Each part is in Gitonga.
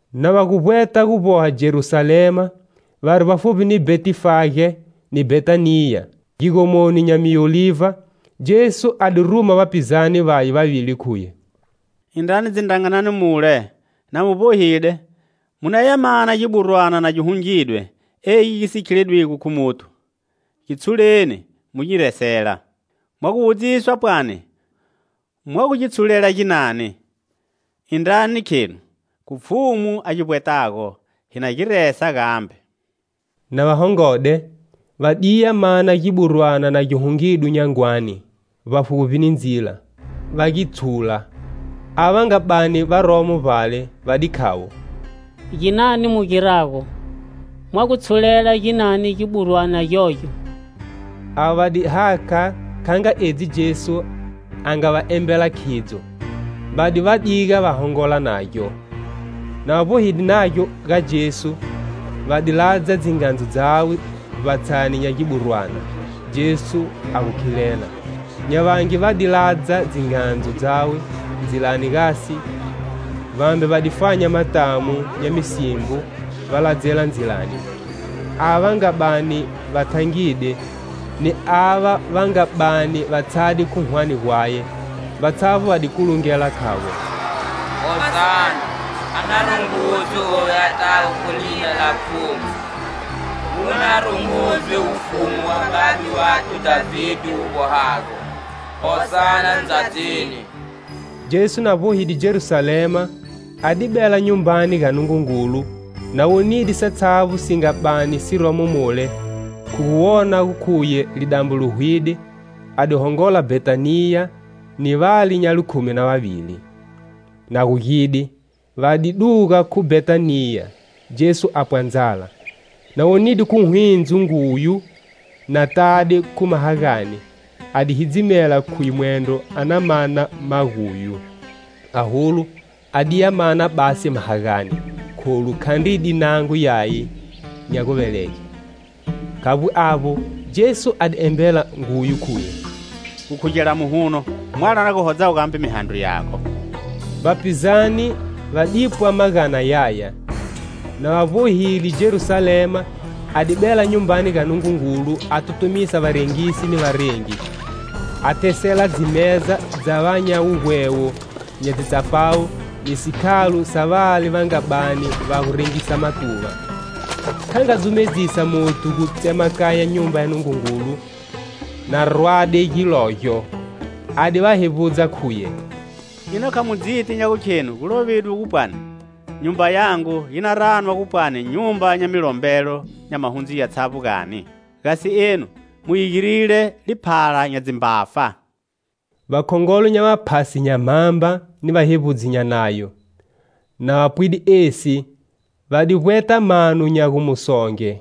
Na va gu vbweta gu vboha Jerusalema, vari vbafuvbi ni Bhetifage ni Bhetaniya, gigomoni nya miolivha, Jesu a di ruma vapizane vaye vavili, khuye: "Indrani dzindrangani mule, na mu vbohide, mu naya mana giburwana na gi hungidwe egi gi si gu khiledwigo khu muthu. Gi tshuleni mu nyi resela. Mwa gu wudziswa pwani mwa gu gi tshulela ginani, indrani khenu khu Pfhumu a gi vbwetago, hi na gi resa gambe." Na va hongode, va diya mana giburwana na gi hungidwe nyangwani, vbafuvbi ni ndzila, va gi tshula. Ava va nga bani varomo vbale va di khavo: "Ginani mu girago? Mwa gu tshulela ginani giburwana gyogyo?" Avo va di hakha kha nga edzi Jesu a nga va embela khidzo. Va di va diga va hongola nagyo. Na va vbohide nagyo ga Jesu, va di ladza dzingandzu dzawe vbatshani nya giburwana, Jesu a gu khilela. Nya vangi va di ladza dzingandzu dzawe ndzilani gasi vambe va di fanya matamu nya misimbo va ladzela ndzilani. Ava va nga bani va thangide ni ava va nga bani va tshade khu hwane gwaye, vatshavbo va di kulungela khavo "Hosana; a na rungudzwe oyu atago khu lina la Pfhumu. Wu na rungudzwe wufumu wa babe wathu Dhavide wu vbohago. Hosana ndzadzini!" Jesu, na vbohide Jerusalema a di bela Nyumbani ga Nungungulu; na wonide satshavbo si nga bani siromo mule, khu gu wona gu khuye lidambo li hwide, a di hongola Bhetaniya ni vale nya likhumi na vavili. Na gugide, va di duga khu Bhetaniya, Jesu apwa ndzala. Na wonide khu hwindzo nguyu na tade khu mahagane, a di hidzimela khuye mwendro a na mana maguyu, aholu a diya mana basi mahagane, kholu khandri di nango yaye nya guvelege. Khavbo avbo, Jesu a di embela nguyu khuye: "Gu khugela muhuno mwalo a na hodzago gambe mihandro yago." Vapizane va dipwa magana yaya. Na va vbohile Jerusalema a di bela Nyumbani ga Nungungulu a tutumisa varengisi ni varengi, a thesela dzimeza dza va nya wugwewo nya dzitsapawu ni sikhalo sa vale va nga bani va gu rengisa matuva. Kha nga dzumedzisa muthu gu tsemakanya Nyumba ya Nungungulu na rwade gilogyo. A di va hevbudza khuye: "Ina kha mu dziti nya gukhenu gu lovidwe gu pwani 'Nyumba yangu yi na ranwa gu pwani nyumba nya milombelo nya mahundzu yatshavbo, gani?' Gasi enu mu yi girile liphala nya dzimbafa." Vakhongolo nya vaphasi nya mhamba ni vahevbudzi nya Nayo, na va pwide esi, va di vbweta mano nya gu mu songe;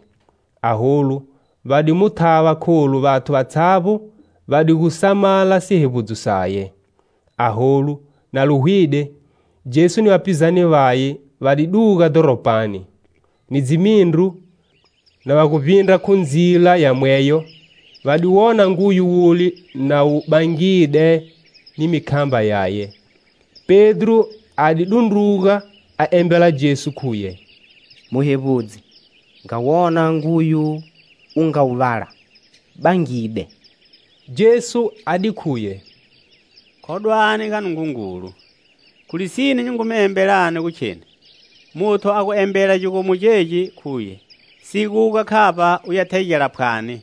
aholu va di mu thava kholu vathu vatshavbo va di gu samala sihevbudzo saye. Aholu, na li hwide, Jesu ni vapizane vaye va di duga dhoropani. Ni dzimindru, na va gu vbindra khu ndzila yamweyo, va di wona nguyu wule na wu bangide ni mikhamba yaye. Pedro a di dundruga, a embela Jesu khuye: "Muhevbudzi, nga wona nguyu u nga wu vala, bangide." Jesu a di khuye: "Khodwani ga Nungungulu. Khu lisine nyi ngu mi embelani gu kheni, muthu a gu embela gigomo gegi khuye siguga khavba uya thegela phwani,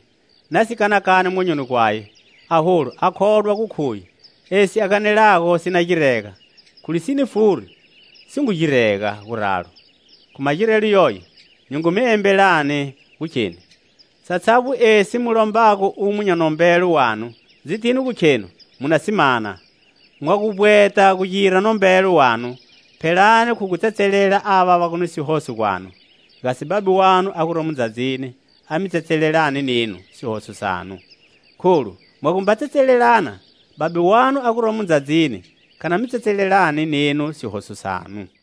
na si kanakani monyoni gwaye, aholu a khodwa gu khuye esi a ganelago si na girega, khu lisine furi si ngu girega guralo. Khu magirelo yoyo, nyi ngu mi embelani gu kheni satshavbo esi mu lombago umo nya nombelo wanu, dzitini gu khenu mu na si mana. Mwa gu vbweta gu gira nombelo wanu phelani khu gu tsetselela ava va gu ni sihoso gwanu, gasi Babe wanu a guromo ndzadzini a mi tsetselelani nenu sihoso sanu. [ Kholu mwa gumba tsetselelana, Babe wanu a guromo ndzadzini kha na mi tsetselelani nenu sihoso sanu.]"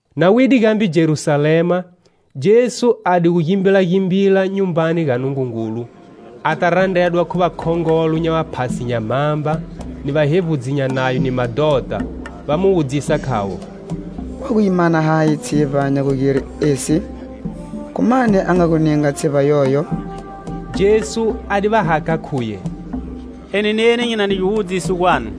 Na wide gambe Jerusalema, Jesu a di gu gimbilagimbila Nyumbani ga Nungungulu, ata randredwa khu vakhongolo nya vaphasi nya mhamba, ni vahevbudzi nya Nayo ni madhota, va mu wudzisa khavo: "Wa gu yi mana hayi tshivba nya gu gire esi? Khu mani a nga gu ninga tshivba yoyo?" Jesu a di va hakha khuye: "Eni neni nyi na ni giwudziso gwanu.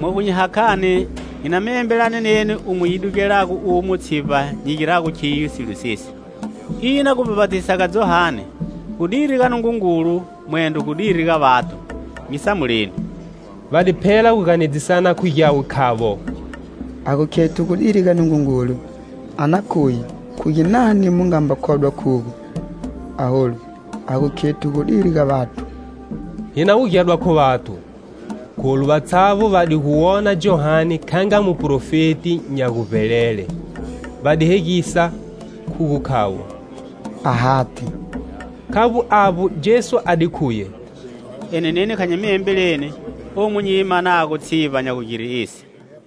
Mwa gu nyi hakhani nyi na mi embela neni umo yi dugelago umo tshivba nyi girago khiyo silo sesi. Ina gubhapatisa ga Johane gu diri ga Nungungulu mwendro gu diri ga vathu? Nyi samuleni." Va di phela gu ganedzisana khu gyawe khavo: "Ha gu khethu gu diri ga Nungungulu, a na khuye khu ginani mu nga mba khodwa khugo? Aholu ha gu khethu gu diri ga vathu, hi na wugedwa khu vathu, kholu vatshavbo va di gu wona Johane kha nga muprofeti nya guvbelele." Va di hegisa khu gu khavo: "Ahati." Khavbo avbo, Jesu a di khuye: "Eni neni Kha nyi mi embelini omu nyi yi manago tshivba nya gugire esi."